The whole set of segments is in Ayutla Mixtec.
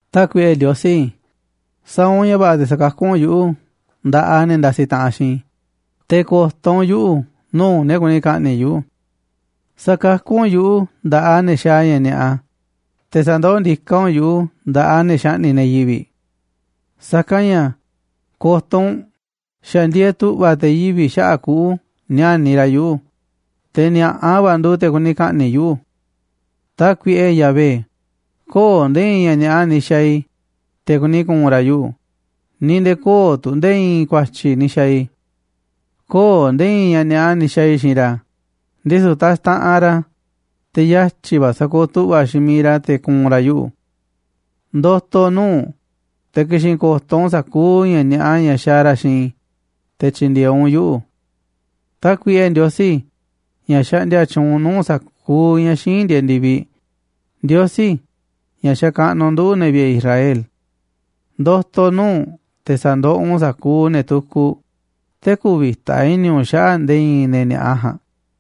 Tákuiꞌe Ndiosí, sa̱a̱ u̱nꞌ ña̱ va̱ꞌa̱ te̱ sakakú u̱nꞌ yuꞌu̱ nda̱ꞌaꞌ ne̱ ndasiꞌ taꞌanꞌ xiinꞌ i̱, te̱ ko̱to̱ u̱nꞌ yuꞌu̱ nuu̱ꞌ ne̱ kuni ka̱ꞌni̱ꞌ yuꞌu̱. Sa̱kakú u̱nꞌ yuꞌu̱ nda̱ꞌaꞌ ne̱ xaaꞌ ña̱ ni̱a̱ꞌa, te̱ sa̱ndoó ndiká u̱nꞌ yuꞌu̱ nda̱ꞌaꞌ ne̱ xaꞌni̱ꞌ ne̱ yivi̱ꞌ. Sa̱kanꞌ ña̱ ko̱to̱ u̱nꞌ, xa̱ ndieeꞌ tu̱ꞌva̱ te̱ yivi̱ꞌ xaꞌa̱ꞌ kuꞌu̱ níániꞌ ra̱ yuꞌu̱, te̱ ni̱a̱ꞌa va̱ nduuꞌ te̱ kuni ka̱ꞌni̱ꞌ yuꞌu̱. Tákuiꞌe Yahvé, köo̱ꞌ nde̱e̱ i̱i̱n ña̱ ni̱a̱ꞌa ni̱ xa̱a̱ i̱, te̱ kuni ku̱u̱n ra̱ yuꞌu̱, ni̱ nde̱e̱ köo̱ꞌ tu̱ nde̱e̱ i̱i̱n ku̱a̱tyi̱ ni̱ xa̱a̱ i̱. Köo̱ꞌ nde̱e̱ i̱i̱n ña̱ ni̱a̱ꞌa ni̱ xa̱a̱ i̱ xiinꞌ ra̱, ndisu̱ taxtaꞌanꞌ ra̱, te̱ yatyi̱ va̱ sa̱kooꞌ tu̱ꞌva̱ xiinꞌ miiꞌ ra̱ te̱ ku̱u̱n ra̱ yuꞌu̱. Ndo̱to̱ nuu̱ꞌ u̱nꞌ, te̱ ki̱xi̱n ko̱to̱ u̱nꞌ sa̱kuuꞌ ña̱ ni̱a̱ꞌa ña̱ xaaꞌ ra̱ xiinꞌ i̱, te̱ tyi̱ndi̱e̱eꞌ u̱nꞌ yuꞌu̱. Tákuiꞌe Ndiosí, ña̱ xaꞌndia tyuunꞌ nuu̱ꞌ sa̱kuuꞌ ña̱ xíinꞌ ndieeꞌ ndi̱viꞌ, Ndiosí, ña̱ xakaꞌnuꞌ nduꞌu̱ꞌ, ne̱ vi̱ꞌe̱ Israel, ndo̱to̱ nuu̱ꞌ u̱nꞌ te̱ sa̱ndoꞌoꞌ u̱nꞌ sa̱kuuꞌ ne̱ tukuꞌ, te̱ kü̱vi̱ta i̱ni̱ u̱nꞌ xaꞌa̱ꞌ nde̱e̱ i̱i̱n ne̱ ni̱a̱ꞌa ja̱a̱nꞌ.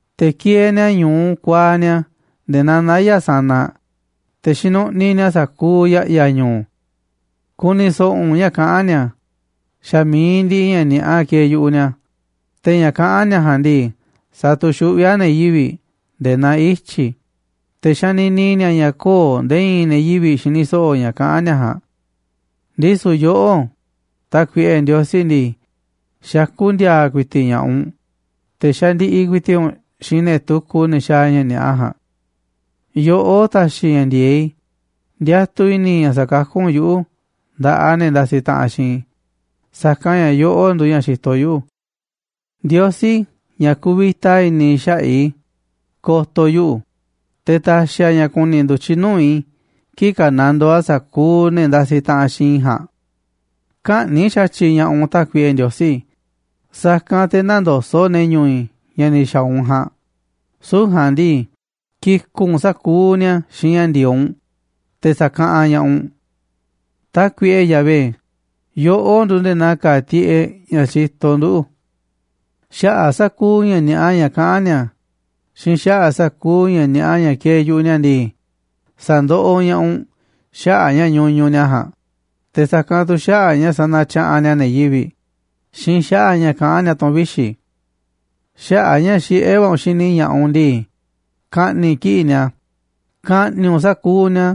Te̱ kieeꞌ ni̱a̱ ñu̱u kuaaꞌ ni̱a̱ nde̱e̱ naa naya̱ꞌ sanaꞌ, te̱ xinuꞌniꞌ ni̱a̱ sa̱kuuꞌ ya̱ꞌya̱ ñu̱u̱. Ku̱ni̱ so̱ꞌo̱ u̱nꞌ ña̱ kaꞌán ni̱a̱, xa̱ mi̱iꞌ ndiꞌiꞌ ña̱ ni̱a̱ꞌa kieeꞌ yu̱ꞌuꞌ ni̱a̱, te̱ ña̱ kaꞌán ni̱a̱ ja̱a̱nꞌ ndii, satuxuꞌví a̱ ne̱ yivi̱ꞌ nde̱e̱ naa ityi̱, te̱ xanini ni̱a̱ ña̱ köo̱ꞌ nde̱e̱ i̱i̱n ne̱ yivi̱ꞌ xini so̱ꞌo̱ ña̱ kaꞌán ni̱a̱ ja̱a̱nꞌ. Ndisu̱ yoꞌó, Tákuiꞌe Ndiosí ndii, xakú ndi̱a̱a̱ ku̱i̱ti̱ꞌ ña̱ꞌaꞌ u̱nꞌ, te̱ xandiꞌiꞌ ku̱i̱ti̱ꞌ u̱nꞌ xiinꞌ ne̱ tukuꞌ, ne̱ xaaꞌ ña̱ ni̱a̱ꞌa ja̱a̱nꞌ. Yoꞌó taxiꞌ ña̱ ndi̱e̱eꞌ i̱, ndiatuꞌ i̱ni̱ i̱ ña̱ sakakú u̱nꞌ yuꞌu̱ nda̱ꞌaꞌ ne̱ ndasiꞌ taꞌanꞌ xiinꞌ i̱, sa̱kanꞌ ña̱ yoꞌó nduuꞌ ña̱ xitoꞌ yuꞌu̱. Ndiosí, ña̱ kuvita i̱ni̱ xaꞌa̱ꞌ i̱, ko̱to̱ yuꞌu̱, te̱ ta̱xi̱ a̱ ña̱ ku̱ni̱ ndu̱tyiꞌ nuu̱ꞌ i̱ kii̱ꞌ ka̱nandoo a̱ sa̱kuuꞌ ne̱ ndasiꞌ taꞌanꞌ xiinꞌ i̱ ja̱a̱nꞌ. Kä̱ꞌni̱ꞌ xa̱tyiꞌ ña̱ꞌaꞌ u̱nꞌ, Tákuiꞌe Ndiosí, sa̱kanꞌ te̱ nä̱ndoso̱ꞌ ne̱ ñu̱u̱ i̱ ña̱ ni̱ xa̱a̱ u̱nꞌ ja̱a̱nꞌ, süu̱ꞌ ja̱a̱nꞌ ndii, ki̱ku̱ꞌ u̱nꞌ sa̱kuuꞌ ni̱a̱ xiinꞌ ña̱ ndi̱e̱eꞌ u̱nꞌ, te̱ sa̱kaꞌanꞌ ña̱ꞌaꞌ u̱nꞌ. Tákuiꞌe Yahvé, yoꞌó nduuꞌ nde̱e̱ naa ka̱a̱ tiꞌeꞌ ña̱ xitoꞌ nduꞌu̱. Xaꞌa̱ꞌ sa̱kuuꞌ ña̱ ni̱a̱ꞌa ña̱ kaꞌán ni̱a̱ xiinꞌ xaꞌa̱ꞌ sa̱kuuꞌ ña̱ ni̱a̱ꞌa ña̱ kieeꞌ yu̱ꞌuꞌ ni̱a̱ ndii, sa̱ndoꞌoꞌ ña̱ꞌaꞌ u̱nꞌ xaꞌa̱ꞌ ña̱ ñuñuꞌ ni̱a̱ ja̱a̱nꞌ, te̱ sa̱kanꞌ tu̱ xaꞌa̱ꞌ a̱ ña̱ sanatyaꞌanꞌ ni̱a̱ ne̱ yivi̱ꞌ, xiinꞌ xaꞌa̱ꞌ ña̱ kaꞌán ni̱a̱ tu̱n vixi̱. Xaꞌa̱ꞌ a̱ ña̱ xiꞌé va̱ u̱nꞌ xini ña̱ꞌaꞌ u̱nꞌ ndii, ka̱ꞌni̱ꞌ kiꞌi̱ꞌ ni̱a̱, ka̱ꞌni̱ꞌ u̱nꞌ sa̱kuuꞌ ni̱a̱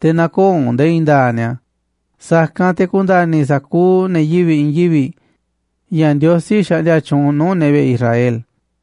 te̱ nä̱ko̱o̱ u̱nꞌ nde̱e̱ i̱i̱n nda̱a̱ꞌ ni̱a̱, sa̱kanꞌ te̱ ku̱nda̱ni̱ sa̱kuuꞌ ne̱ yivi̱ꞌ i̱i̱n yivi̱ꞌ ña̱ Ndiosí xaꞌndia tyuunꞌ nuu̱ꞌ ne̱ vi̱ꞌe̱ Israel.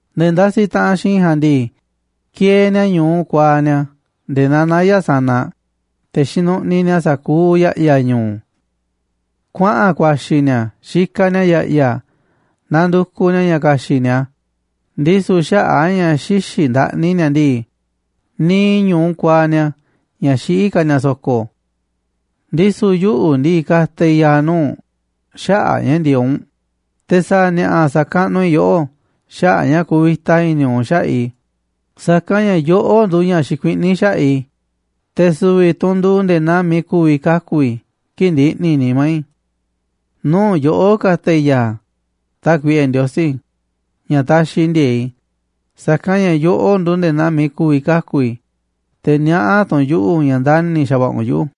Ne̱ ndasiꞌ taꞌanꞌ xiinꞌ i̱ ja̱a̱nꞌ ndii, kieeꞌ ni̱a̱ ñu̱u kuaaꞌ ni̱a̱ nde̱e̱ naa naya̱ꞌ sanaꞌ, te̱ xinuꞌniꞌ ni̱a̱ sa̱kuuꞌ ya̱ꞌya̱ ñu̱u̱. Kuaꞌa̱n ku̱a̱xi̱ ni̱a̱ xikaꞌ ni̱a̱ ya̱ꞌya̱ nandukuꞌ ni̱a̱ ña̱ ka̱xi̱ꞌ ni̱a̱, ndisu̱ xaꞌa̱ꞌ a̱ ña̱ xïxiꞌ ndaꞌni ni̱a̱ ndii, niiꞌ ñu̱u kuaaꞌ ni̱a̱ ña̱ xiꞌí ka̱ ni̱a̱ so̱ko̱. Ndisu̱ yuꞌu̱ ndii, ka̱ta̱ i̱ ya̱a̱ nuuꞌ u̱nꞌ xaꞌa̱ꞌ a̱ ña̱ ndi̱e̱eꞌ u̱nꞌ, te̱ sa̱a̱ ni̱a̱ꞌa̱ sa̱kaꞌnuꞌ i̱ yoꞌó xaꞌa̱ꞌ a̱ ña̱ kuvita i̱ni̱ u̱nꞌ xaꞌa̱ꞌ i̱, sa̱kanꞌ ña̱ yoꞌó nduuꞌ ña̱ xikuiꞌní xaꞌa̱ꞌ i̱, te̱ su̱vi̱ tu̱ u̱nꞌ nduuꞌ nde̱e̱ naa miiꞌ ku̱vi̱ kaku̱ i̱ kii̱ꞌ ndiꞌni̱ nimá i̱. Nuu̱ꞌ yoꞌó ka̱ta̱ i̱ ya̱a̱, Tákuiꞌe Ndiosí, ña̱ taxiꞌ ndi̱e̱e̱ꞌ i̱, sa̱kanꞌ ña̱ yoꞌó nduuꞌ nde̱e̱ naa miiꞌ ku̱vi̱ kaku̱ i̱, te̱ niaꞌá tu̱ u̱nꞌ yuꞌu̱ ña̱ ndani̱ xa̱va̱ꞌa̱ u̱nꞌ yuꞌu̱.